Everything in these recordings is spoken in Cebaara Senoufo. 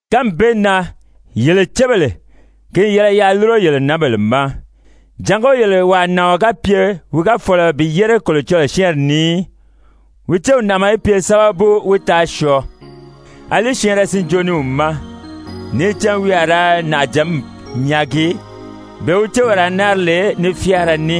Kánmi bee na, yele cébèle, ki n yɛlɛ yaa lúro yele nǎnbèle ma, jàngó yele wàa nàɔn ga pye wi ga fɔ̀lɔ bi yére Kolocɔlɔɔ syɛ́ɛnri ni í, wi céw nàʔama í pye sábabu wí taa syɔɔ, àlí syɛɛnrɛ sinjoo ni wi ma, níì cán wi a ra nàʔajǎnmi nyaagi, bee wi céw a ra náari lè ní fyáara ní.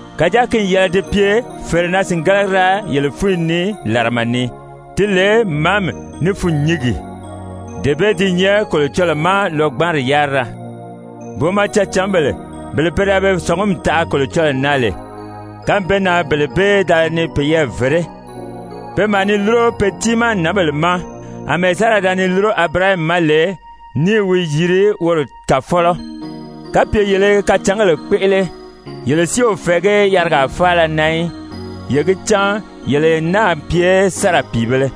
kàjáa ki n yɛlɛ di pye fèrenaa-sìngalagira yele fúnyi ni làrama ni, ti lè màámi ní fûnnyingi. Dee bee di nyɛ Kolocɔlɔɔ má lɔgbanri yárira. Booma cecǎnbèle bele pe da be sɔ̀ngumi taʔa Kolocɔlɔɔ na lè, kánmi bee na bele bee da ni peyɛɛ vèré, pe maa ni lúro pe tiimaa nǎnbèle ma, àmɛɛ Sara da ni lúro Abirahami ma lè ní i wi yiri woro kàfɔlɔ. Kapye yele i kacǎngèle kpéʔele, yele si o fɛ̀ɛgí yarigaa faala na í, ye gi cán yele n náà pye Sara pìibēle.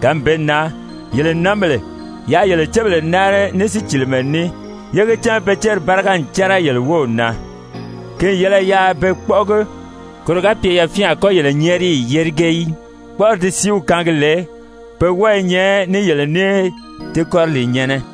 Kánmi bee na, yele nǎnbèle, yaa yele cébèle náari ní sícilimɛ ní, yé gi cán pe céri báriga n cɛ́rɛ yele wów na. Ki n yɛlɛ yaa be kpɔ́ʔɔgi, koro ga pye yafyɛn a kɔ́ yele nyɛ́ɛriyi yérige í, kpɔ́ʔɔri ti sìíw kaangi lè, pe wɔ́ɔ i nyɛ ní yele ní ti kɔriliinyɛ̀nnɛ.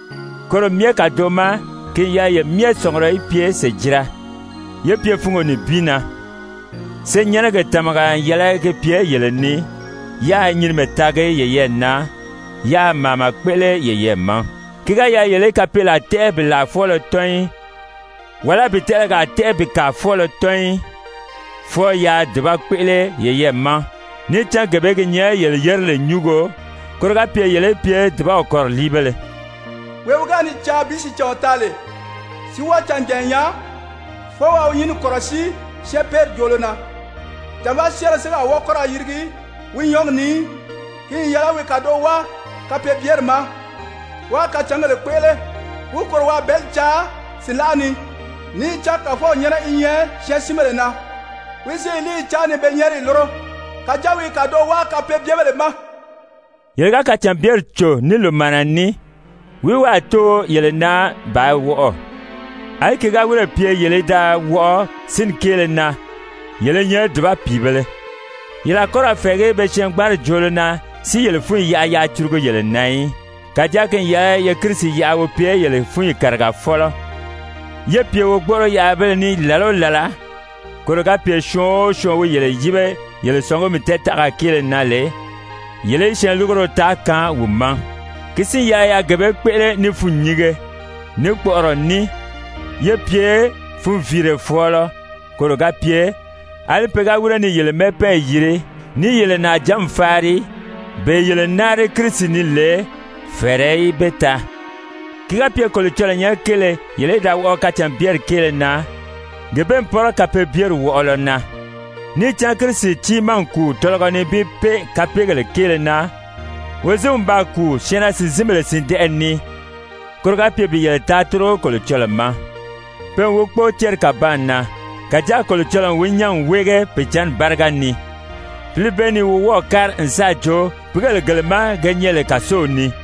Koro myɛ kàdoʔo ma ki n yɛlɛ ye myɛ sɔ̀ngurɔ í pye sèjira, yé pye fungo nibin na. Senyɛnnɛgi tàmaga n yɛlɛ gi pye yele ni, yáā nyinimɛ taagi yeyɛɛ na, yáā màama kpéʔele yeyɛɛ ma. Ki ga yɛlɛ yele í kapeelaa tɛ́ʔɛ bi làa fwɔ́ɔlɔ tɔ́n í, wàlá bi tɛʔɛlɛgaa tɛ́ʔɛ bi kàa fwɔ́ɔlɔ tɔ́n í. Fwɔɔ yaa dùba kpéʔele yeyɛɛ ma, níì cán gee bee gi nyɛ yele yerili nyúngo, koro ga pye yele í pye dùbaw kɔriliibéle. «Wee wi ga ni caa bi sìicǎnw taa lè, si wɔ́ɔ canjànya nyaa, fwɔɔ waa wi nyínni kɔ̀rɔsíi syɛɛnpeeri joolo na, jànvaa syɛ́ɛnrɛ si a wɔ́ɔ kɔ́ ra yirigi wi nyɔ́ɔgi ni í. Ki n yɛlɛ wi kàdoʔo wáa kapeebyeri ma, wáā kacǎngèle kpéʔele, wi kòro waa bɛ̀ɛ́li caa sìnlaʔa ni. Níì cán Kàfɔw nyɛ́nɛ i nyɛ syɛɛnsinbèle na. Wi i wi líiyi cáan ni be nyɛ́ɛriyi lúro. Kàjáa wi i kàdoʔo wáa kapeebyebèle ma.» Yele ga kacànbyeri cò ní lòmaana ní, wìí wi a too yele na bàā wɔʔɔ? Alí ki ga wírè pye yele í da wɔʔɔ sínni kéele na, yele i nyɛ dùba pìibēle! Yele a kɔ́ ra fɛ̀ɛgí be syɛɛngbanri joolo na si yele fúnyi yaʔa yaa curugu yele na í. Kàjáa ki n yɛlɛ ye Kirisi yaʔa wi pye yele fúnyi kàrigafɔlɔ, yé pye wogboʔoro-yaʔabéle ní làla o làla, koro ga pye syɔɔn o syɔɔn wi yele yíbe yele sɔ̀ngumi tɛɛtaʔaga kéele na lè, yele í syɛɛnlurugoro taa kaan wi ma. Ki si n yɛlɛ yaa gee bee kpéʔele ní fûnnyinge, ní kpɔʔɔrɔ ní, yé pye funviire fɔ̀ɔlɔ, koro ga pye, àlí pe ga wíre ni yele mɛ́ɛpɛɛnyi yiri, ní i yele nàʔajǎnmi faari, bee yele náari Kirisi ni lè, fɛ̀ɛrɛ í be taa. Ki ga pye Kolocɔlɔɔ nyɛ́nɛ kéele yele í da wɔʔɔ kacànbyeri kéele na, gee bee n pɔ́rɔ kapeebyeri wɔʔɔlɔ na. Níì cán Kirisi tiimaa n kùu tɔlɔgɔ nibin pée kapeegèle kéele na, wozinw n baa kùu syɛɛnnaa-sìnzinbèle sìndɛʔɛ ni, koro ga pye bi yele taa tórigo Kolocɔlɔɔ ma. Pe n wi kpóo céri kàbaan na, kàjáa Kolocɔlɔɔ n wi nyán n wéege Pìicǎnni báriga ni. Pǐli bee ni wi wɔ́ɔ̀ kári n sáà joo pìígèle gele ma ge nyɛ lè kàsow ni.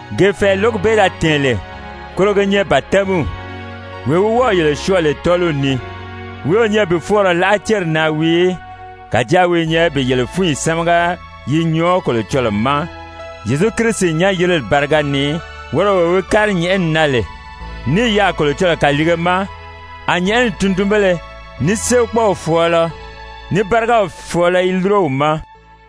Gee fɛ̀ɛ lǒgi bee da tɛ̀ɛn lè, koro gi nyɛ batɛmiw, wee wi wɔ́ɔ̀ yele syɔɔ lè tɔ́ɔliw ni, wi o nyɛ bi fɔɔnrɔ láʔa céri na wii í, kàjáa wi i nyɛ bi yele fúnyi sámaga yi nyɔɔ Kolocɔlɔɔ ma, Zyezu Kirisi nyán-yirili báriga ni, woro wee wi kári nyɛ̀ʔɛni na lè, ní i yaà Kolocɔlɔɔ kàliige ma, a nyɛ̀ʔɛni tundunbéle, ní séekpɔɔw fɔ̀ɔlɔ, ní bárigaw fɔ̀ɔlɔ i lúro wi ma.